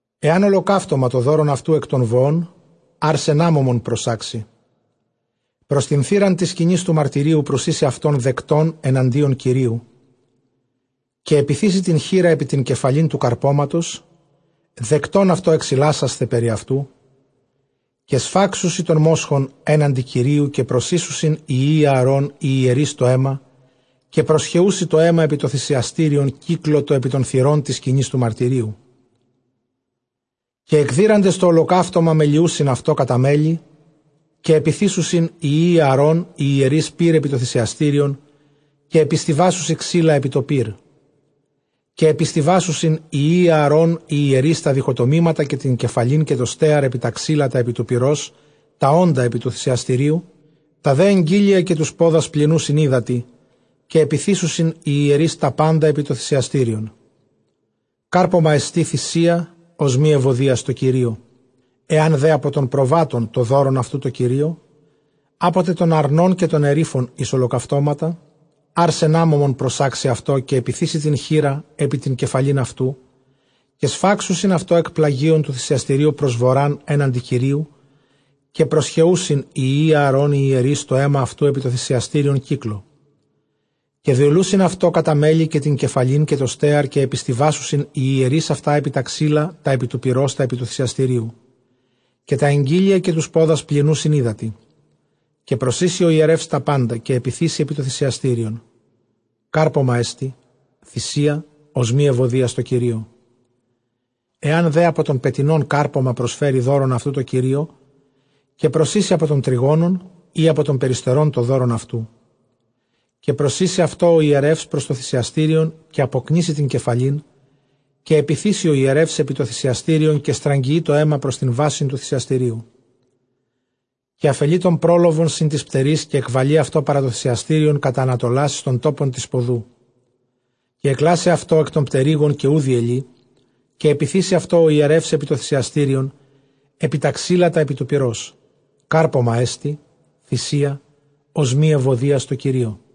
Ἐὰν ὁλοκαύτωμα τὸ δῶρον αὐτοῦ, ἐκ τῶν βοῶν ἄρσεν ἄμωμον προσάξει πρὸς τὴν θύραν τῆς σκηνῆς τοῦ μαρτυρίου, προσοίσει αὐτὸ δεκτὸν ἐναντίον Κυρίου. Καὶ ἐπιθήσει τὴν χεῖρα ἐπὶ τὴν κεφαλὴν τοῦ καρπώματος δεκτὸν αὐτῷ, ἐξιλάσασθαι περὶ αὐτοῦ. Καὶ σφάξουσι τὸν μόσχον ἔναντι Κυρίου· καὶ προσοίσουσιν οἱ υἱοὶ Ἀαρὼν οἱ ἱερεῖς τὸ αἷμα, καὶ προσχεοῦσι τὸ αἷμα ἐπὶ τὸ θυσιαστήριον κύκλῳ τὸ ἐπὶ τῶν θυρῶν τῆς σκηνῆς τοῦ μαρτυρίου· καὶ ἐκδείραντες τὸ ὁλοκαύτωμα, μελιοῦσιν αὐτὸ κατὰ μέλη. Καὶ ἐπιθήσουσιν οἱ υἱοὶ Ἀαρὼν οἱ ἱερεῖς πῦρ ἐπὶ τὸ θυσιαστήριον, καὶ ἐπιστοιβάσουσι ξύλα ἐπὶ τὸ πῦρ. Καὶ ἐπιστοιβάσουσιν οἱ υἱοὶ Ἀαρὼν οἱ ἱερεῖς τὰ διχοτομήματα, καὶ τὴν κεφαλὴν, καὶ τὸ στέαρ ἐπὶ τὰ ξύλα τὰ ἐπὶ τοῦ πυρὸς τὰ ὄντα ἐπὶ τοῦ θυσιαστηρίου. Τὰ δὲ ἐγκοίλια καὶ τοὺς πόδας πλυνοῦσιν ὕδατι· καὶ ἐπιθήσουσιν οἱ ἱερεῖς τὰ πάντα ἐπὶ τὸ θυσιαστήριον· κάρπωμά ἐστι θυσία ὀσμὴ εὐωδίας τῷ Κυρίῳ. Ἐὰν δὲ ἀπὸ τῶν προβάτων τὸ δῶρον αὐτοῦ τῷ Κυρίῳ, ἀπό τε τῶν ἀρνῶν, καὶ τῶν ἐρίφων εἰς ὁλοκαυτώματα, ἄρσεν ἄμωμον προσάξει αὐτό. Καὶ ἐπιθήσει τὴν χεῖρα ἐπὶ τὴν κεφαλὴν αὐτοῦ· καὶ σφάξουσιν αὐτὸ ἐκ πλαγίων τοῦ θυσιαστηρίου πρὸς βοῤῥᾶν ἔναντι Κυρίου· καὶ προσχεοῦσιν οἱ υἱοὶ Ἀαρὼν οἱ ἱερεῖς τὸ αἷμα αὐτοῦ ἐπὶ τὸ θυσιαστήριον κύκλῳ. Καὶ διελουσιν αὐτὸ κατὰ μέλη, καὶ τὴν κεφαλὴν, καὶ τὸ στέαρ· καὶ ἐπιστοιβάσουσιν οἱ ἱερεῖς αὐτὰ ἐπὶ τὰ ξύλα τὰ ἐπὶ τοῦ πυρὸς τὰ ἐπὶ τοῦ θυσιαστηρίου. Καὶ τὰ ἐγκοίλια, καὶ τοὺς πόδας πλυνοῦσιν ὕδατι· καὶ προσοίσει ὁ ἱερεὺς τὰ πάντα, καὶ ἐπιθήσει ἐπὶ τὸ θυσιαστήριον· κάρπωμά ἐστι θυσία ὀσμὴ εὐωδίας τῷ Κυρίῳ. Ἐὰν δὲ ἀπὸ τῶν πετεινῶν κάρπωμα προσφέρει δῶρον αὐτοῦ τῷ κυρίῳ, καὶ προσοίσει ἀπὸ τῶν τρυγόνων, ἢ ἀπὸ τῶν περιστερῶν τὸ δῶρον αὐτοῦ. Καὶ προσοίσει αὐτὸ ὁ ἱερεὺς πρὸς τὸ θυσιαστήριον, καὶ ἀποκνίσει τὴν κεφαλήν, καὶ ἐπιθήσει ὁ ἱερεὺς ἐπὶ τὸ θυσιαστήριον, καὶ στραγγιεῖ τὸ αἷμα πρὸς τὴν βάσιν τοῦ θυσιαστηρίου. Καὶ ἀφελεῖ τὸν πρόλοβον σὺν τοῖς πτεροῖς, καὶ ἐκβαλεῖ αὐτὸ παρὰ τὸ θυσιαστήριον κατʼ ἀνατολὰς εἰς τὸν τόπον τῆς σποδοῦ· Καὶ ἐκκλάσει αὐτὸ ἐκ τῶν πτερύγων, καὶ οὐ διελεῖ, καὶ ἐπιθήσει αὐτὸ ὁ ἱερεὺς ἐπὶ τὸ θυσιαστήριον ἐπὶ τὰ ξύλα τὰ ἐπὶ τοῦ πυρός· κάρπωμά ἐστι θυσία ὀσμὴ εὐωδίας τῷ Κυρίῳ.